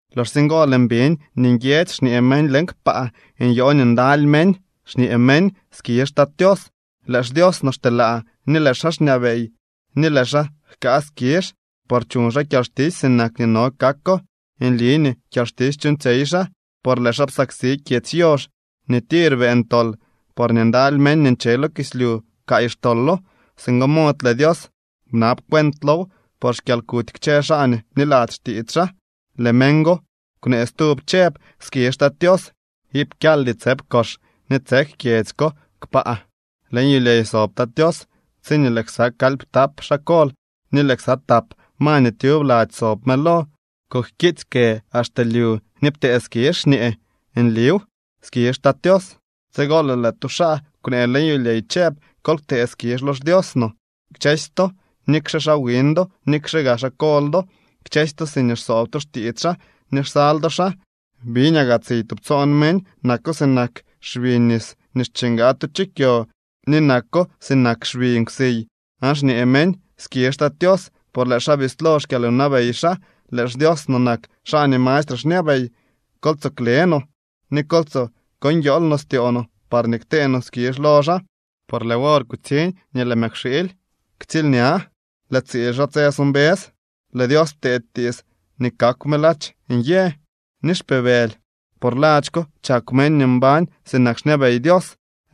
Loxsye ngo lëën biñ nii nguiedzy xñee meñ leñ kpaa. Nyoo nii ndaly meñ, xñee meñ: ¡Skizh Tat Tios! Lëë xDios no xteelaa ni lëë xaa xñabey ni lëë xaa jkaa skizh, por chuñ xaa kyalxtisy sinak nii no kako. Nli nii kyalxtisy chuuñtsyey xaa, por lëë xaa psaksi kyedzy yox nii tir beeñ tol, porñee ndaly meñ nii nche lo kislyu pkaay xtolo. Singo mod lëë Dios bnab cuent low por xkyalkuty kchë xaa nii bniladzy xtiits xaa. Lëë meñ go kwnee stub chëb: —¡Skizh Tat Tios! Iip kyaldy tsëp kox nii tsek kyedzy ko kpaa. Leñ yulyey sob Tat Tios tsiñee lëë ksa kalyptap xaa kol ni lëë ksa tap ma nii tyub lady sob mëlo kujkiitsy kë axte lyu ni ptee skizh xñee: —¡Nliw! ¡Skizh Tat Tios! Tsigo lëë lëë tu xaa kwnee leñ yulyey chëb: Kol ktee skizh lo xDios no kchësy to, nikxe xaa wiñ do, nikxe gaa xaa kol do, kchësy to siñee xsoob to xtiits xaa ni xsal do xaa. Biñaa gaa tsiy tubtsoon meñ. Nako sinak xbi nis nii xchingaa tu chu kyo ni nako sinak xbi nkwsiy aan xñee meñ: ¡Skizh Tat Tios! Por lëë xaa bislo xkyalwnabey xaa. Lëë xDios no nak xaa nii mastre xñabey. Kol tsoo kle no, ni kol tsoo ko nguiool no styoo no parñee ktee no skizh lo xaa. Por lëë wor kutsiñ nii lëë Mëkwxiily ktsiilña. Lëë tsiil xaa tse so mbës. Lëë Dios ptee tiits nii kakw me ladx nyë ni xpibëly, por ladx ko chakw meñ nii mbañ sinak xñabey Dios.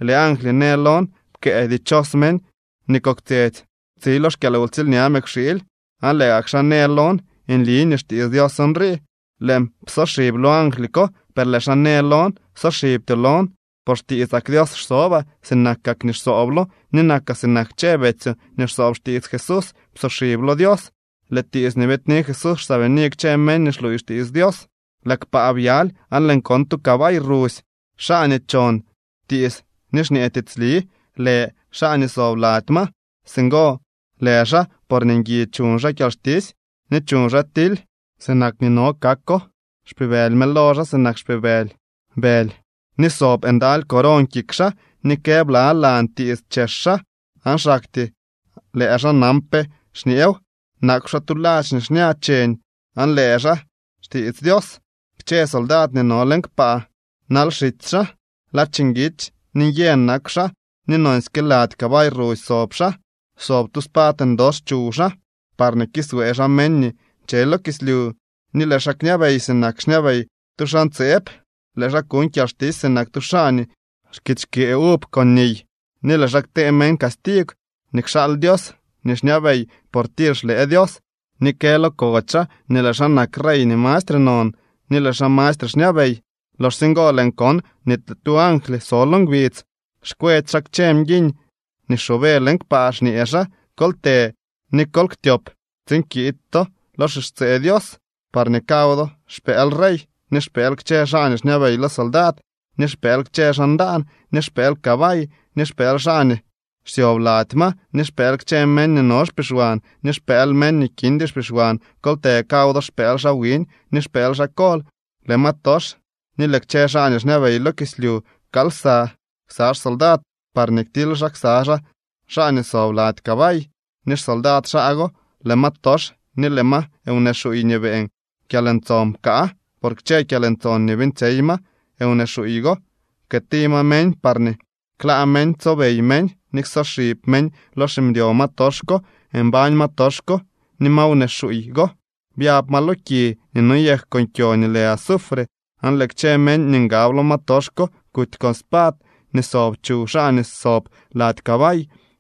Lëë angly në lon: —Pkëë: “Dichos meñ nii koktsyetsy tsi lo xkyalwtsiilña Mëkwxiily.” Aan lëë gak xaa në lon: —Nli nii xtiits Dios nrii. Lëën psoxib lo angly ko, per lëë xaa në lon: —Ksoxibtyoo lon, por xtiitsak Dios xsobaa sinakak nii xsooblo, ni nakaa sinak kchë betsyoo nii xsoob xtiits Jesús. Psoxib lo Dios. Lëë tiits nii biidni Jesús xsaabini kchë meñ nii xluuy xtiits Dios. Lëë kpaa byaly, aan lëën kon tu cabay rusy. Xaa nii chon tiits ni xñee tiitsli lë xaa nii sob lady ma. Singo lë xaa porñee ngui chuñ xaa kyalxtisy ni chuñ xaa tily sinak nii no kako. Xpibëly mëlo xaa sinak xpibëly bëly ni sob ndaly coron kik xaa ni kë blalan tiits chex xaa aan xaktyee lëë xaa nan pe xñeew. Nakw xaa tu ladx nii xña cheñ aan lë xaa xtiits Dios. Kchë soldad nii no leñ kpaa nal xitsy xaa. Ladx nguitsy ni nyë nakw xaa nii nonsyke lady cabay rusy sob xaa. Sob tu spad ndox chuw xaa, parñee kiswee xaa meñ nii nche lo kislyu, ni lëë xaa kñabey sinak xñabey tu xaa ntseeb. Lëë xaa kuñ kyalxtisy sinak tu xaa nii xkitsy xkyee uv con niy, ni lëë xaa ktee meñ castigw nii kxaal Dios nii xñabey por tir xlëë Dios. Ni kë lo kodx xaa nii lëë xaa nak rey nii mastre non ni lëë xaa mastre xñabey. Loxsye ngo lëën kon nii lëë tu angly so lo ngbidz, xkwetsy xaa kchë mguiñ nii xoobe leñ kpaa xñee xaa: —Kol të ni kol ktyop tsiin kiid to lo xixtsee Dios, parñee kaw do xpëël rey, ni xpëël kchë xaa nii xñabey lo soldad ni xpëël kchë xaa ndaan, ni xpëël cabay ni xpëël xaa nii xsyob lady ma, ni xpëël kchë meñ nii no xpixwan ni xpëël meñ nii kindy xpixwan. Kol të kaw do xpëël xaa wiñ ni xpëël xaa kol. Lëë ma tox ni lëë kchë xaa nii xñabey lo kislyu pkaal lsa ksa xsoldad parñee ktily xaa ksa xaa xaa nii sob lady cabay ni xsoldad xaa go. Lëë ma tox ni lëë ma wnee xuuy nii beeñ kyalntson pkaa. Por kchë kyalntson nii beeñtsyey ma wnee xuuy go pkëëti ma meñ parñee klaa meñ tsobey meñ ni ksoxib meñ lo ximdyo ma tox ko. Mbañ ma tox ko ni ma wnee xuuy go, byab ma lo ki nii noyek con kyo nii lë azufre. Aan lëë kchë meñ nii ngab lo ma tox ko kuty conspad nii sob chuw xaa nii sob lady cabay,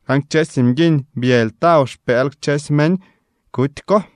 aan kchësy mguiñ byëly taw xpëël kchësy meñ kuty ko.